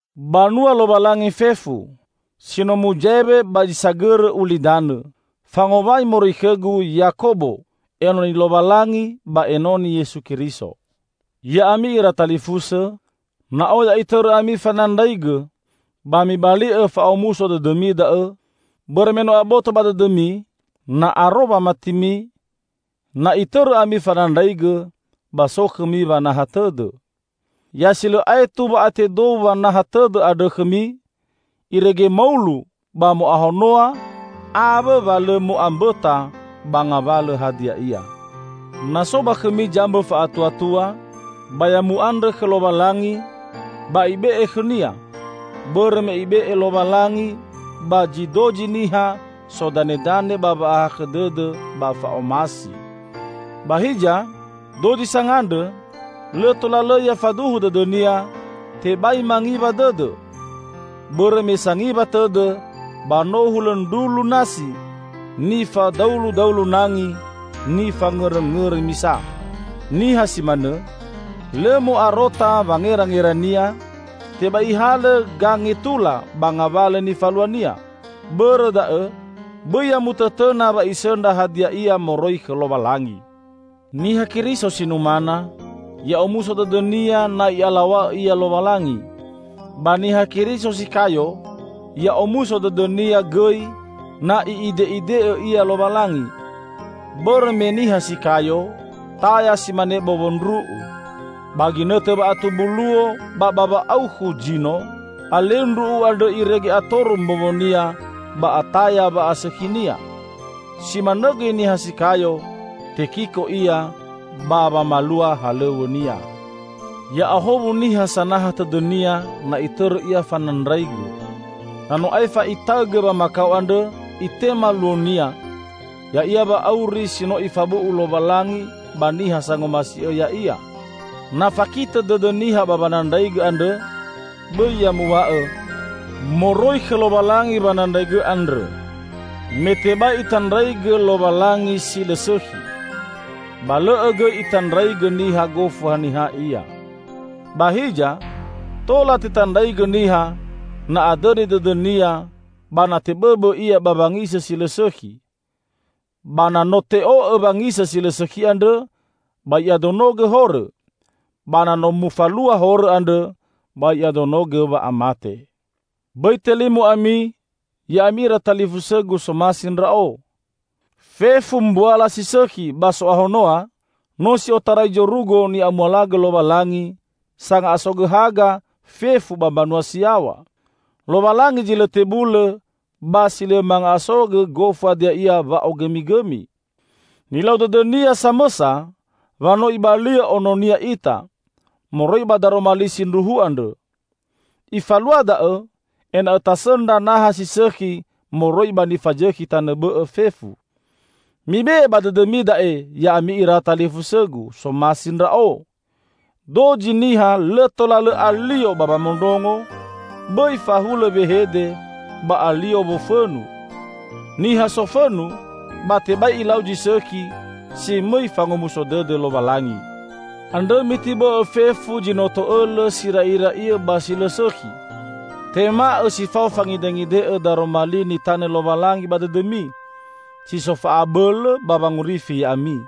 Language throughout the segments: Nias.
Banua Lowalangi fefu, si no muzaewe ba zi sagõrõ ulidanõ! Fangowai moroi khõgu, Yakobo, enoni Lowalangi ba enoni Yesu Keriso. Ya'ami ira talifusõ! Na oya itõrõ ami fanandraigõ, ba mibali'õ fa'omuso dõdõmi da'õ. Bõrõ me no aboto ba dõdõmi, na aro wamatimi na itõrõ ami fanandraigõ, ba so khõmi wanaha tõdõ. Ya si lõ aetu wa'atedou wanaha tõdõ andrõ khõmi, irege maulu ba mo'ahonoa awõ wa lõ mo'ambõta ba ngawalõ hadia ia. Na so ba khõmi zambõ fa'atuatua, ba ya mu'andrõ khõ Lowalangi, ba Ibe'e khõnia, bõrõ me Ibe'e Lowalangi ba zi dozi niha sodanedane ba wa'ahakhõ dõdõ ba fa'omasi. Ba hiza, dozi sangandrõ, lõ tola lõ ya faduhu dõdõnia; tebai mangiwa dõdõ. Bõrõ me sangiwa tõdõ ba no hulõ ndrulu nasi, nifadauludaulu nangi, ni fangõrõngõrõ misa. Niha si manõ, lõ mo'arota wangerangerania, tebai ihalõ gangetula ba ngawalõ nifaluania. Bõrõ da'õ, bõi ya mutõtõna wa isõndra hadia ia moroi khõ Lowalangi. Niha Keriso si numana, ya'omuso dõdõnia na I'alaw̃a'õ ia Lowalangi. Ba Niha Keriso si kayo ya'omuso dõdõnia gõi na I'ide'ide'õ ia Lowalangi. Bõrõ me niha si kayo, taya si mane bowo ndru'u. Ba ginõtõ wa'atumbu luo ba ba wa'aukhu zino, aleu ndru'u andrõ irege atoru mbowonia ba ataya wa'asõkhinia. Si manõ gõi niha si kayo; tekiko ia ba wamalua halõw̃õnia. Ya'ahowu niha sanaha tõdõnia na itõrõ ia fanandraigõ. Na no aefa itaõgõ wamakao andrõ, itema luonia, ya'ia wa'auri si no Ifabu'u Lowalangi ba niha sangomasi'õ Ya'ia. Na fakitõ dõdõ niha ba wanandraigõ andrõ, bõi ya muw̃a'õ, "Moroi khõ Lowalangi wanandraigõ andrõ," me tebai itandraigõ Lowalangi si lõ sõkhi, ba lõ'õ gõi itandraigõ niha gofu haniha ia. Ba hiza, tola tetandraigõ niha, na adõni dõdõnia ba na tebõbõ ia ba wangisõ si lõ sõkhi. Ba na no te'o'õ wangisõ si lõ sõkhi andrõ ba i'adonogõ horõ; ba na no mufalua horõ andrõ, ba i'adonogõ wa'amate. Bõi telimo ami, ya'ami ira talifusõgu somasi ndra'o! Fefu mbuala si sõkhi ba so'ahonoa, no si otarai zorugo, ni'amualagõ Lowalangi, sanga'asogõ haga fefu ba mbanua si yaw̃a. Lowalangi zi lõ tebulõ ba si lõ manga'asogõ gofu hadia ia wa'ogõmigõmi. Nilau dõdõ-Nia samõsa wa no Ibali'õ Ono-Nia ita, moroi ba daroma li sindruhu andrõ. Ifalua da'õ, ena'õ tasõndra naha si sõkhi moroi ba nifazõkhi tanõ bõ'õ fefu. Mi be'e ba dõdõmi da'e, ya'ami ira talifusõgu, somasi ndra'o! Dozi niha lõ tola lõ alio ba wamondrongo, bõi fahulõ wehede ba alio wofõnu. Niha sofõnu ba tebai ilau zi sõkhi, si mõi fangomuso dõdõ Lowalangi. Andrõ mitibo'õ fefu zi no to'õlõ si ra'ira'iõ ba si lõ sõkhi. Tema'õ si fao fangide'ngide'õ daroma li nitanõ Lowalangi ba dõdõmi, si so fa'abõlõ ba wangorifi ya'ami.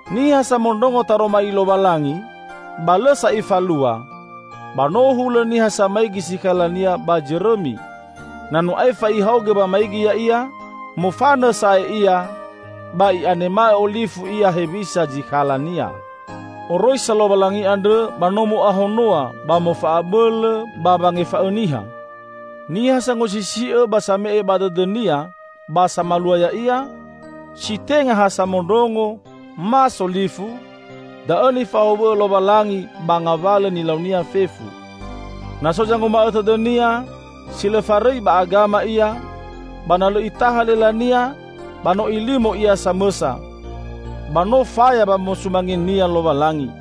Niha samondrongo taroma li Lowalangi, ba lõ sa ifalua, ba no hulõ niha samaigi sikhalania ba zõrõmi. Na no aefa ihaogõ wamaigi ya'ia, mofanõ sa'ae ia, ba i'anema'õ olifu ia hewisa zikhalania. Oroisa Lowalangi andrõ ba no mo'ahonoa ba mofa'abõlõ ba wangefa'õ niha. Niha sangosisi'õ ba same'e ba dõdõnia ba samalua ya'ia, si tenga ha samondrongo, ma solifu, da'õ nifahowu'õ Lowalangi ba ngawalõ nilaunia fefu. Na so zanguma'õ tõdõnia, si lõ farõi ba agama ia, ba na lõ itaha lelania, ba no ilimo ia samõsa; ba no faya wamosumangenia Lowalangi.